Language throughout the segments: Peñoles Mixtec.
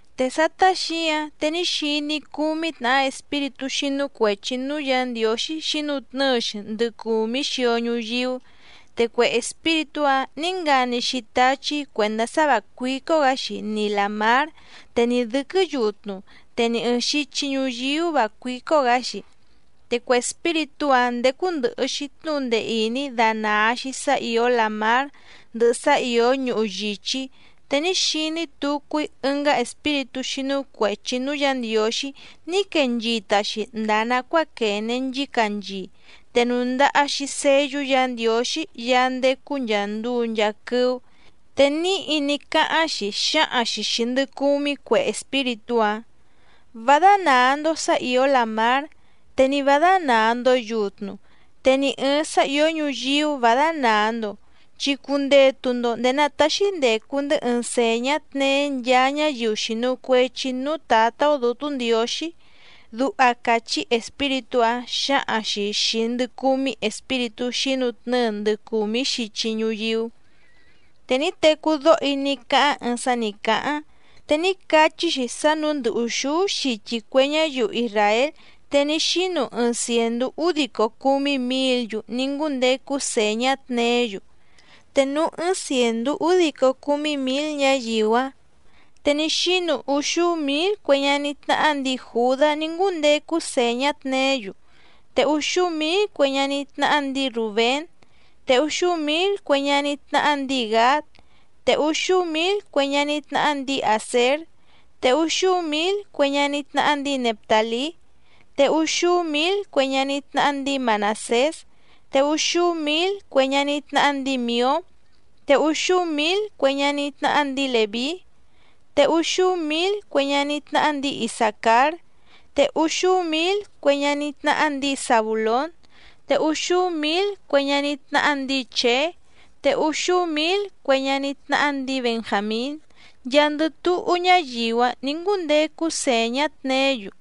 Te sátá xǐǎⁿ te ní xiní‑í cúmí tnàhá espíritú xínú cuèchi núú Yǎ Ndiǒxí xǐnutnɨ́ɨ‑xi ndɨ cùmí xio ñuyíú, te cue espíritú‑áⁿ nǐ ngani‑xi táchí cuèndá sá vǎ cuícó‑gǎ‑xi ni làmár, te ni dɨ̌quɨ́ yutnu, te ni ɨ̀ɨⁿ xichi ñuyíú vǎ cuícó‑gǎ‑xi. Te cue espíritú‑áⁿ ndécú ndɨ̀hɨ‑xi tnúhu ndee ìní danàa‑xi sá ìó làmár ndɨhɨ sá ìó ñuhu yìchí, te ní xiní tucu‑í ɨngá espíritú xínú cuèchi núú Yǎ Ndiǒxí ní quee nchita‑xi ndàa nacuáa quène nchícanchii, te nùndaha‑xi seyú Yǎ Ndiǒxí Yaá ndécú nchàa nduu nchaa quɨ́ú, te níhi ní cáháⁿ‑xi xǎhaⁿ‑xi xìi ndɨ cumí cue espíritú‑áⁿ: —Vá dánàa‑ndo sá ìó làmár, te ni vǎ dánàa‑ndo yutnu, te ni ɨ̀ɨⁿ sá ìó ñuyíú vǎ dánàa‑ndo, chi cundetu‑ndo ndèé ná tàxi ndecu‑ndɨ́ ɨɨⁿ sèñá tneé nchaa ñáyiu xìnu cuechi núú Tǎtá‑ó Dǔtú Ndiǒxí —duha càchí espíritú‑áⁿ xǎhaⁿ‑xi xìi ndɨ cumí espíritú xǐnutnɨ́ɨ ndɨ cùmí xichi ñuyíú. Te ní tecú dóho‑í ní cáháⁿ ɨɨⁿ sá nǐ cáháⁿ, te ní cachí‑xi sá nǔú ndɨ́ ùxúú xichi cue ñáyiu isràél te ní xínu ɨɨⁿ cièndú údico cúmí mǐl‑yu ní ngúndecu sèñá tneé‑yu. Te núú ɨ́ɨ́ⁿ cièndú údico cúmí mǐl ñáyiu‑áⁿ, te ní xínu úxúú mǐl cue ñaní tnáhá ndǐi Jùdá ní ngúndecu sèñá tneé‑yu, te úxúú mǐl cue ñaní tnáhá ndǐi Rùbén, te úxúú mǐl cue ñaní tnáhá ndǐi Gǎd, te úxúú mǐl cue ñaní tnáhá ndǐi Àsér, te úxúú mǐl cue ñaní tnáhá ndǐi Neftàlí, te úxúú mǐl cue ñaní tnáhá ndǐi Manàsés, te úxúú mǐl cue ñaní tnáhá ndǐi Mìó, te úxúú mǐl cue ñaní tnáhá ndǐi Lèví, te úxúú mǐl cue ñaní tnáhá ndǐi Isàcár, te úxúú mǐl cue ñaní tnáhá ndǐi Zabùlón, te úxúú mǐl cue ñaní tnáhá ndǐi Chèé, te úxúú mǐl cue ñaní tnáhá ndǐi Benjàmín, nchaandɨ túhú ñáyiu‑áⁿ nǐ ngúndecu sèñá tneé‑yu.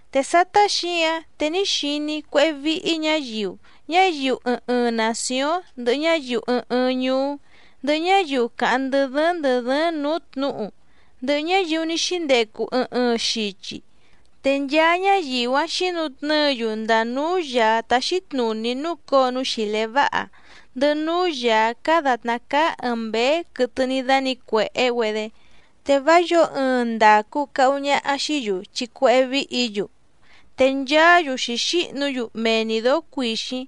Te sátá xǐǎⁿ te ní xiní‑í cuéhé víhí ñǎyiu, ñáyiu ɨɨⁿ ɨɨⁿ nàcióⁿ, ndɨhɨ ñáyiu ɨɨⁿ ɨɨⁿ ñuú, ndɨhɨ ñáyiu càháⁿ ndɨ dɨ́ɨ́ⁿ ndɨ̀ dɨ́ɨ́ⁿ nǔú tnǔhu, ndɨhɨ ñáyiu ní xíndecu ɨɨⁿ ɨɨⁿ xichi, te nchaa ñáyiu‑áⁿ xǐnutnɨ́ɨ‑yu ndàa núú Yàá táxí tnùní núcǒo núú xìlé váha, ndɨhɨ núú Yàá cáá dàtná cáá ɨ̀ɨⁿ mbéé quɨtɨ ní dánǐcuèhé‑güedé, te vá yǒo ɨɨⁿ ndàcu cahu ñaha xií‑yu chi cuéhé víhǐ‑yu, te nchaá‑yu xǐxíhnu‑yu mee‑ni dǒó cuìxíⁿ,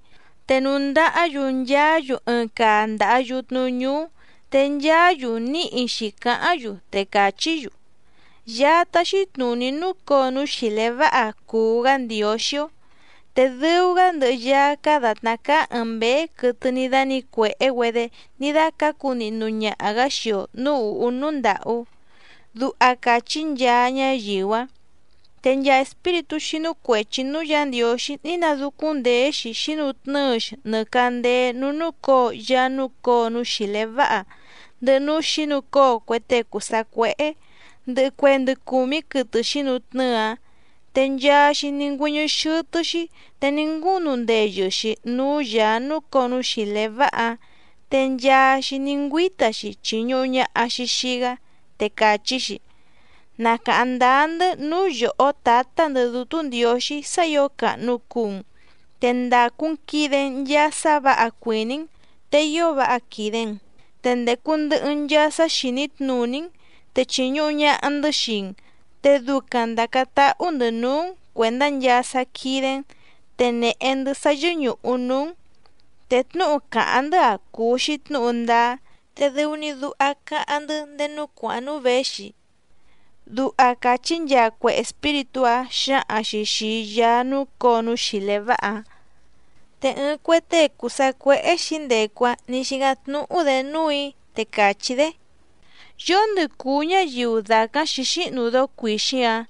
te nùndahá‑yu nchaá‑yu ɨɨⁿ caa ndàha yutnu ñúú. Te nchaá‑yu níhi xǐcáháⁿ‑yu, te càchí‑yu: Yaá táxí tnùní núcǒo núú xìlé váha cùu‑gá Ndiǒxí‑ó, te dɨu‑gá ndɨhɨ Yaá cáá dàtná cáá ɨ̀ɨⁿ mbéé quɨtɨ ní dánǐcuèhé‑güedé ní dácǎcu nihnu ñaha‑gǎ xii‑o nǔú ùhú núú ndàhú. Duha càchí nchaa ñáyiu‑áⁿ. Te nchaa espíritú xínú cuèchi núú Yǎ Ndiǒxí ní nadúcúⁿndèé‑xi xǐnutnɨ́ɨ‑xi nɨ càndéé núú núcǒo Yaá núcǒo núú xìlé váha, ndɨhɨ núú xǐnucóo cue tée cùu sacuéhé, ndɨhɨ cue ndɨ cùmí quɨtɨ xǐnutnɨ́ɨ‑áⁿ, te nchaa‑xi ní ngüɨ́ñɨ́ xɨ́tɨ́‑xí te ní ngúnu ndeyɨ‑xi núú Yàá núcǒo núú xìlé váha‑áⁿ, te nchaa‑xi ní ngüíta‑xi chìñuhu ñaha‑xi xii‑gá, te càchí‑xi: Na càháⁿ ndáá‑ndɨ́ núú yòhó Tǎtá‑ndɨ̌ Dútú Ndiǒxí sá ǐo càhnu cuu‑n, te ndàcu‑n quide‑n nchaa sá vǎha cuìní‑n, te ío váha quìde‑n, te ndècu ndɨhɨ‑n nchaa sá xìní tnùní‑n, te chìñuhu ñaha‑ndɨ́ xii‑n, te ducaⁿ ndàcáⁿ táhú‑ndɨ̌ núú‑n cuèndá nchaa sá quídé‑n, te nèhe‑ndɨ́ sá yɨ́ñùhu núú‑n, te tnúhu càháⁿ‑ndɨ́‑a cùu‑xi tnúhu ndáá, te dɨu‑ni duha cáháⁿ‑ndɨ́ ndéé núú cuàháⁿ núú věxi. Duha càchí nchaa cue espíritú‑áⁿ xǎhaⁿ‑xi xìi Yaá núcǒo núú xìlé váha‑áⁿ. Te ɨɨⁿ cue tée cùu sacuéhé xǐndecu‑áⁿ nǐ xícáⁿ tnúhú‑dě núù‑í, te càchí‑dé: —¿Yóndɨ cùu ñáyiu dàcáⁿ xǐxíhnu dóó cuìxíⁿ‑ǎⁿ,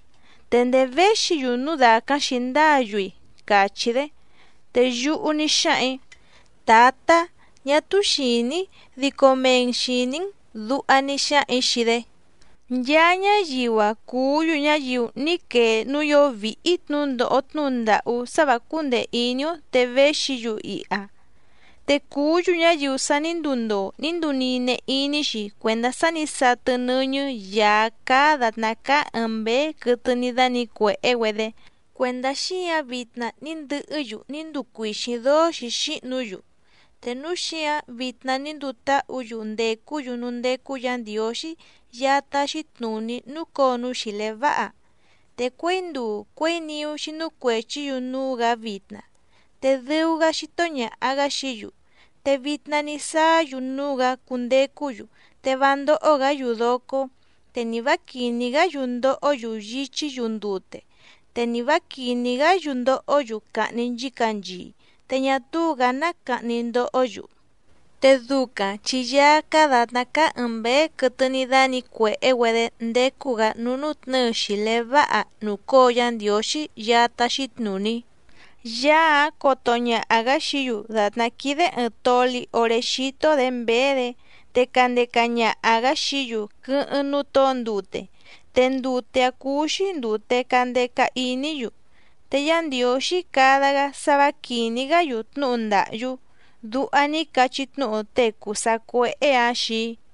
te ndèé véxi‑yu núu dàcáⁿ xǐndáǎ‑yu‑i? —càchí‑dé. Te yúhú ní xáhaⁿ‑ǐ: —Tǎtá, ñá túú xìní‑í, dico mee‑n xìní‑n —duha ní xáhaⁿ‑ǐ xii‑dé. Te dǎtnùní ní cachí tnúhu‑dé xii‑í ná cúú ñǎyiu‑áⁿ, te càchí‑dé: —Nchaa ñáyiu‑a cùú‑yu ñáyiu ní quee núú ìó víhí tnǔhu ndòho tnúhu ndàhú sá vǎ cúndèe iní‑ó te véxi‑yu iha, te cùú‑yu ñáyiu sa ní nduu ndoo ní nduu nine iní‑xi cuèndá sá nǐ satɨ nɨ́ñɨ́ Yàá cáá dàtná cáá ɨ̀ɨⁿ mbéé quɨtɨ ní dánǐcuèhé‑güedé, cuèndá xíǎⁿ vitna ní ndɨhɨ́‑yu ní nduu cuìxíⁿ dóó xǐxíhnu‑yu. Te núu xíǎⁿ vitna ní nduu táhǔ‑yu ndècú‑yu núú ndécú Yǎ Ndiǒxí Yaá táxí tnùní núcǒo núú xìlé váha, te cuěi nduu cuěi niú xínú cuèchí‑yu núú‑gǎ vitna, te dɨu‑gá xító ñàha‑gá xií‑yu. Te vitna ní sáá‑yu núú‑gǎ cundecú‑yu te vá ndóhó‑gǎ‑yu docó, te ni vǎ quìní‑gá‑yu ndohó‑yu yíchí‑yu ndute, te ni vǎ quìní‑gá‑yu ndohó‑yu cahni nchícanchii, te ñá túú‑gǎ ná cahni ndohó‑yu. Te ducaⁿ chi Yaá cáá dàtná cáá ɨ̀ɨⁿ mbéé quɨtɨ ní dánǐcuèhé‑güedé ndécú‑gǎ núú nútnɨ̌ɨ xìlé váha nùcóo Yá Ndiǒxí Yaá táxí tnùní, Yaá‑áⁿ coto ñaha‑gǎ xií‑yu dàtná quídé ɨ̀ɨⁿ toli oré xító‑dě mběé‑dě, te candeca ñaha‑gǎ xií‑yu quɨ́hɨ́ⁿ núú tǒo ndute, te ndute‑áⁿ cúú‑xí ndùte candeca iní‑yu, te Yá Ndiǒxí cada‑gá sá vǎ quìní‑gá‑yu tnúhu ndàhyú —duha ní cachí tnúhu tée cùu sacuéhé‑ǎⁿ xii‑í.